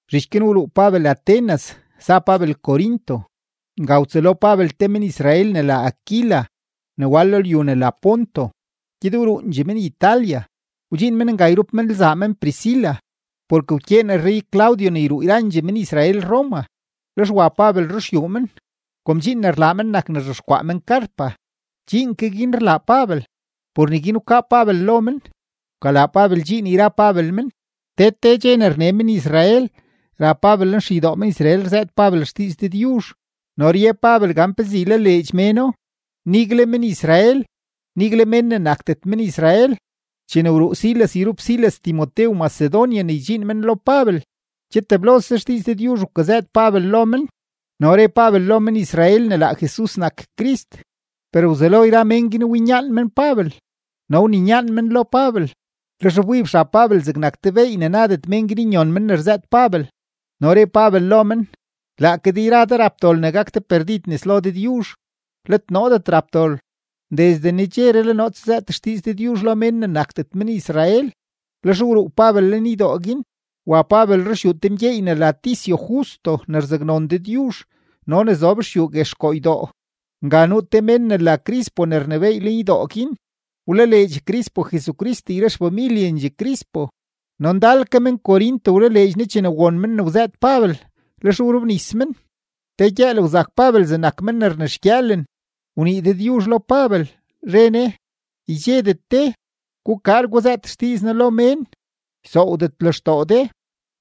Zhich guin wruu Pabel Atenas, za Pabel Corinto. Nga wtsëlo Pabel te men-Israel ne la Aquila ne wal lo lyu ne la Ponto; gyed wruundxee men Italia, wdxiin men nga yrup men lzaa men Priscila, porke wkyeen rrey-Claudio ne yruu yrandxee men-Israel Roma. Lex wa Pabel ruxyuu men. Kom dxiin ne rlaa men nak ne rzhexkwaa men carpa, dxiin ke guin rlaa Pabel, por neguin wkaa Pabel lo men, wkalaa Pabel dxiin yra Pabel men. Te te dxe ne rne men-Israel, ra Pabel lenxeydoo men-Israel rzëët Pabel xdiiz Dëdyuzh no rye Pabel gan pezee ylaleedx méno, nigle men-Israel, nigle mén ne nakdet men-Israel. Chene wruu Silas yrup Silas Timotew Macedonia ne wdxiin men lo Pabel, che teblose xdiiz Dëdyuzh wkazëët Pabel lo mén no re Pabel lo men-Israel ne laa Jesus nak Crist. Per wzelo yra mén guin winyaan men Pabel no wninyaan men lo Pabel. Lex wbib xab Pabel zegnak te beey ne nadet men guin nyon men ne rzëët Pabel, no re Pabel lo men: ―Laake de yra de rap dol ne gak de perdid nes lo Dëdyuzh, let noodet rap dol. Desde nedxeree le noo tsazëët xdiiz Dëdyuzh lo mén ne nakdet men-Israel. Lex wruu Pabel lenydoo guin, wa Pabel ruxyuu te mgyeey ne la Ticio Justo ne rzaknon Dëdyuzh no ne zob xyuu guex koo ydoo. Nga nuu te mén ne la Crispo ne rnebééy lenydoo guin, wlaleedx Crispo Jesucrist yra xfamilyendxee Crispo, no ndal ke men-Corinto wlaleedx Ne chene won men ne wzëët Pabel, lex wrobnis men. Te gyëël wzak Pabel zegnak men ne rnexgyëëlen, wnii Dëdyuzh lo Pabel, re Ne: ―Ydxedet de; gukaar guzëët xdiiz noo lo mén, ysoowdet lextoo de,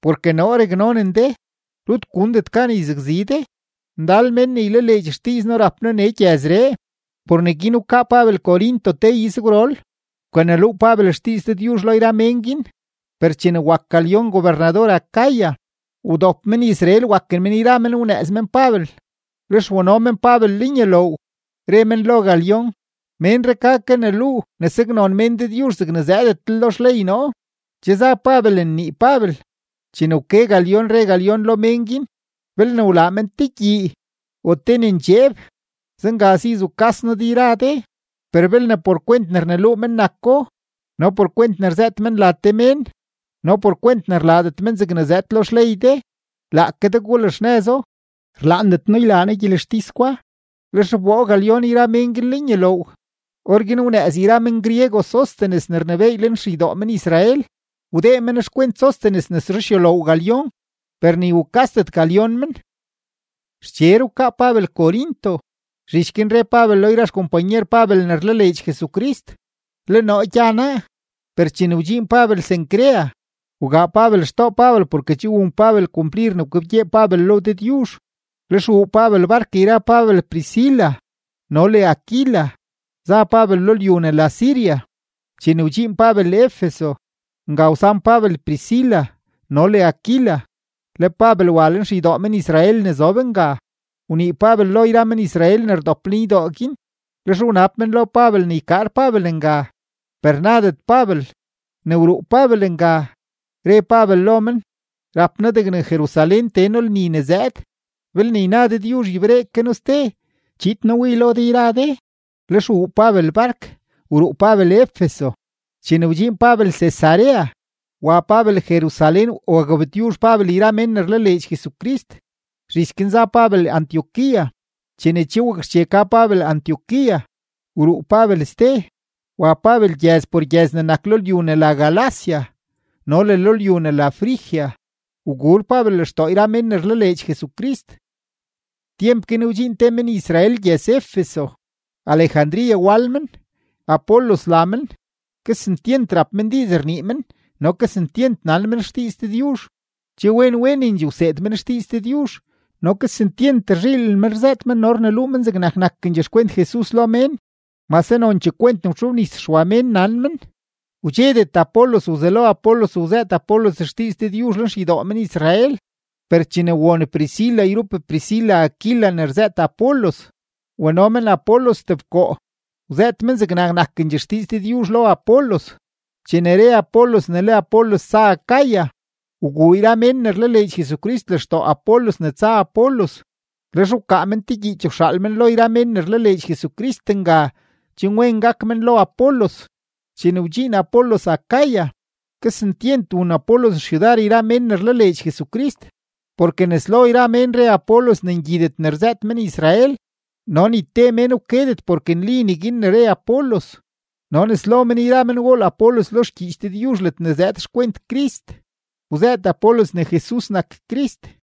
porke noo raknonen de; rut gundet gan yzakzi de. Ndal mén ne ylaleedx xdiiz noo rap noo nee gyëzree. Por neguin wkaa Pabel Corinto te izgwrol, wkaneluu Pabel xdiiz Dëdyuzh lo yra mén guin. Per chene wak Galión gobernador Acaya, wdop men-Israel, waken men yra men wnëëz men Pabel, lex wano men Pabel lenyuloow, re men lo Galión: ―Ménree ka kaneluu ne saknon mén Dëdyuzh zegne zëëdetlel lo xley noo. Che za Pabel nnii Pabel, chene wke Galión, re Galión lo mén guin: ―Belne wlaa men te gyii o te ne ndxeeb, zenga si zukas noo de yra de. Per belne por kwent ne rneluu men nako, no por kwent ne rzëët men la te mén, no por kwent ne rlaadet men zegne zëëd lo xley de, laake de gulaxnëzo. Rlaandet noo ylaa noo gyelextis gwa. Lex wboo Galión yra men guin lenyuloow. Orguin wnëëz yra men-griego Sóstenes ne rnebééy lenxeydoo men-Israel, wdee men xkwent Sóstenes nes ruxyuloow Galión; per ni wukasdet Galión men. Xcher wkaa Pabel Corinto. Zhich guin re Pabel lo yra xkompanyer Pabel ne rlaleedx Jesucrist: “Le noo gya naa.” Per chene wdxiin Pabel Cencrea, wgaa Pabel xtoo Pabel porke che wun Pabel kumplir ne wkebgyee Pabel lo Dëdyuzh. Lex wuu Pabel bark yra Pabel Priscila no le Aquila, za Pabel lo lyu ne la Siria. Chene wdxiin Pabel Efeso, nga wsan Pabel Priscila no le Aquila, le Pabel wa lenxeydoo men-Israel ne zob nga, wnii Pabel lo yra men-Israel ne rdop lenydoo guin. Lex wnab men lo Pabel ne ykaar Pabel nga, per nadet Pabel. Ne wruu Pabel nga, re Pabel lo men: ―Rap noo degne Jerusalén tee noo lni ne zëëd. Belne yna Dëdyuzh yberee ke noo ste, chiid noo wii lo de yra de. Lex wuu Pabel bark, wruu Pabel Efeso. Chene wdxiin Pabel Cesarea, wa Pabel Jerusalén wagabtyuzh Pabel yra mén ne rlaleedx Jesucrist; zhich guin za Pabel Antioquía. Chene che wakxche ka Pabel Antioquía, wruu Pabel ste, wa Pabel gyëz por gyëz ne nak lo lyu ne la Galacia no le lo lyu ne la Frigia, waguur Pabel lextoo yra mén ne rlaleedx Jesucrist. Tyemp guin wdxiin te men-Israel gyëz-Efeso, Alejandría wal men, Apolos la men. Kesentyent rap men diiz rnii men no kesentyent nan men xdiiz Dëdyuzh. Che wen wenendxee wseed men xdiiz Dëdyuzh, no kesentyent rzhiilen men rzëët men no rneluu men zegnak nakendxee xkwent Jesus lo mén, mase nonchee kwent ne wtxobnis Xwa mén nan men. Wdxedet Apolos wzelo Apolos wzëët Apolos xdiiz Dëdyuzh lenxeydoo men-Israel; per chene won Priscila yrup Priscila Aquila ne rzëët Apolos, wano men Apolos tebkoo, wzëët men zegnak nakendxee xdiiz Dëdyuzh lo Apolos. Chene re Apolos ne le Apolos tsa Acaya, wguu yra mén ne rlaleedx Jesucrist lextoo Apolos ne tsa Apolos, lex wkaa men te gyiich wxaal men lo yra mén ne rlaleedx Jesucrist nga chen wen gak men lo Apolos. Chene wdxiin Apolos Acaya, kesentyent wun Apolos xyudar yra mén ne rlaleedx Jesucrist, porke nes lo yra mén re Apolos ne ngyidet ne rzëët men-Israel, no ni te mén wkedet porke nli neguin ne re Apolos, no nes lo men yra men wool Apolos lo xgyiich Dëdyuzh ledne zëëd xkwent Crist, wzëët Apolos ne Jesus nak Crist.